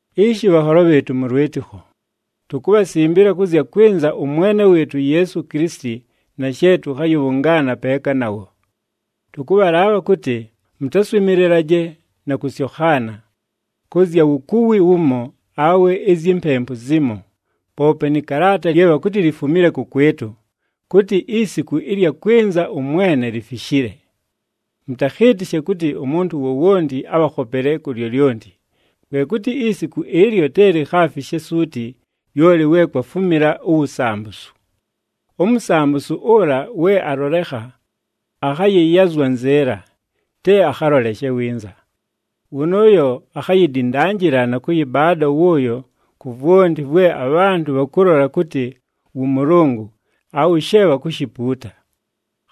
Ishi bhanholo bhɨɨtʉ mʉ lwɨtɨkho, tukubhasimbila kʉ zya kwɨnza ʉMwene wɨɨtʉ uYeesu Kilisiti na she tʉkhayɨbhʉngaana peeka nawo. Tʉkʉbhalaabha kʉtɨ mʉtaswɨmɨlɨlaje na kʉsyokhaana, kʉ zya wukuwi wumo awe izyi mpempu zimo, poope nɨ kalaata lye bhakʉtɨ lifumile kʉkwɨtʉ, kʉtɨ isiku ɨlya kwɨnza ʉMwene lifishile. Mʉtakhɨɨtɨshe kʉtɨ umuntu wowonti abhakhopele ku lyolyonti, kwe kʉtɨ isiku ɨlyo te likhaafishe suuti, lyoli we kwafumila uwusambusu. UMusambusu ʉla we alolekha, akhayɨyazwa nzɨɨla, te akhaloleshe winza. Wʉnʉʉyo akhayidindanjila na kʉyɨbaada wʉʉyo ku vwonti vwe abhantʉ bhakʉlola kʉtɨ wʉ Mʉlʉngʉ awe she bhakushipuuta.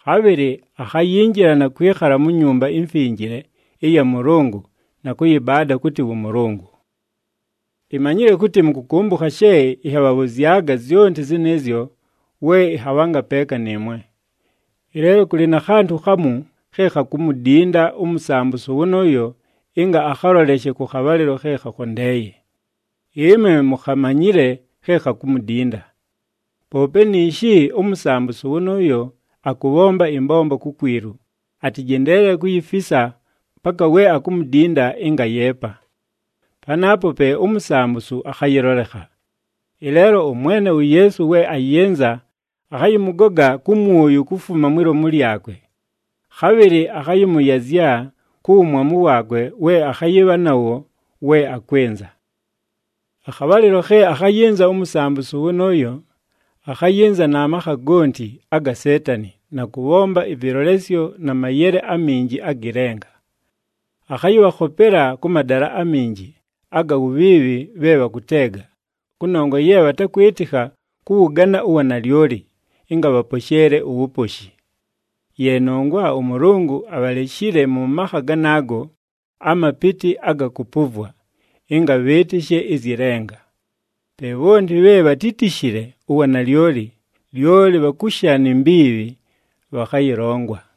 Khabhɨlɨ akhayinjila na kwɨkhala mu Nyumba iMfinjile ɨya Mʉlʉngʉ na kʉyɨbaada kʉtɨ wʉ Mʉlʉngʉ. Imanyile kʉtɨ mʉkʉkʉmbʉkha she ɨnhabhabhʉzyaga zyonti zɨnɨɨzyo we ɨnhabhanga peeka nɨɨmwe. Ɨleelo kʉlɨ na khantʉ khamu khe khakumudinda uMusambusu wʉnʉʉyo ɨnga akhaloleshe kʉ khabhalɨlo khe khakhondeeye. Ɨmwe mukhamanyile khe khakumudinda. Poope niishi uMusambusu wʉnʉʉyo akʉbhomba ɨmbombo kukwilu, atɨjendeelele kuyifisa paka we akumudinda ɨnga ayeepa. Panaapo pe uMusambusu akhayɨlolekha. Ɨleelo ʉMwene uYeesu we ayɨnza akhayɨmʉgoga kʉ mwʉyʉ kufuma mwi lomu lyakwe. Khabhɨlɨ akhayɨmʉyazya ku wumwamu waakwe we akhayɨbha nawo we akwɨnza. Akhabhalɨlo khe akhayɨnza uMusambusu wʉnʉʉyo, akhayɨnza na makha gonti aga Seetani na kʉbhomba ɨvɨlolesyo na mayele aminji agɨ lenga. Akhayɨbhakhopela kʉ madala aminji aga wubhiibhi bhe bhakʉteega, kʉnongwa ye bhatakwɨtɨkha kʉwʉgana uwanalyoli ɨnga bhaposheele uwuposhi. Ye nongwa ʉMʉlʉngʉ abhaleshile mʉ makha ganaago amapɨtɨ aga kʉpʉvwa, ɨnga bhɨɨtɨshe ɨzyɨ lenga. Pe bhonti bhe bhatítishile uwanalyoli, lyoli bhakusha ni mbiibhi, bhakhayɨlongwa.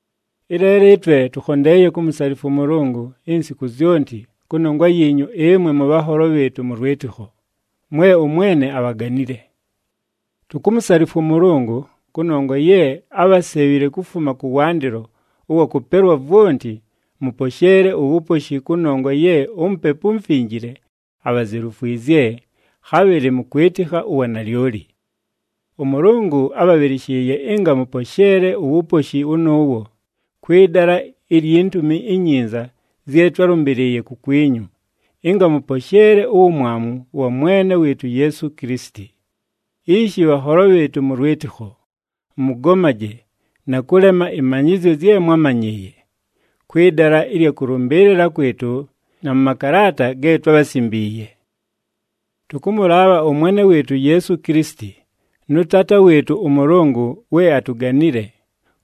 Ɨleelo ɨtwe tʉkhondeeye kumusalifwa ʉMʉlʉngʉ insiku zyonti kʉnongwa yiinyu ɨmwe mʉbhanholo bhɨɨtʉ mʉ lwɨtɨkho, mwe ʉMwene abhaganile. Tukumusalifwa ʉMʉlʉngʉ kʉnongwa ye ábhasebhile kufuma kʉwandɨlo ʉwa kʉpelwa vwonti mʉposheele uwuposhi kʉnongwa ye uMupepu uMufinjile abhazelufwizye, khabhɨlɨ mʉkwɨtɨkha uwanalyoli. ɄMʉlʉngʉ ábhabhɨlɨshɨɨye ɨnga mʉposheele uwuposhi wʉnʉʉwo, kwɨ dala ilyi Ntumi iNyinza zye twálʉmbɨlɨɨye kukwinyu, ɨnga mʉposheele uwumwamu wa Mwene wɨɨtʉ uYeesu Kilisiti. Ishi bhanholo bhɨɨtʉ mʉ lwɨtɨkho, mʉgomaje na kʉlema ɨmanyɨzyo zye mwámanyɨɨye, kwɨ dala ɨlya kʉlʉmbɨɨlɨla kwɨtʉ na mʉ makalaata ge twábhasimbiiye. Tʉkʉmʉlaabha ʉMwene wɨɨtʉ uYeesu Kilisiti nʉ Taata wɨɨtʉ ʉMʉlʉngʉ we atuganile,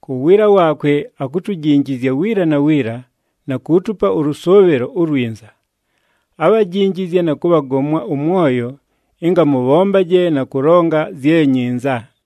ku wiila waakwe akutujinjizya wiila na wiila na kuutupa ʉlʉsʉʉbhɨlo ulwinza, abhajinjizye na kʉbhagomwa ʉmwoyo ɨnga mʉbhombaje na kʉlonga zye nyinza.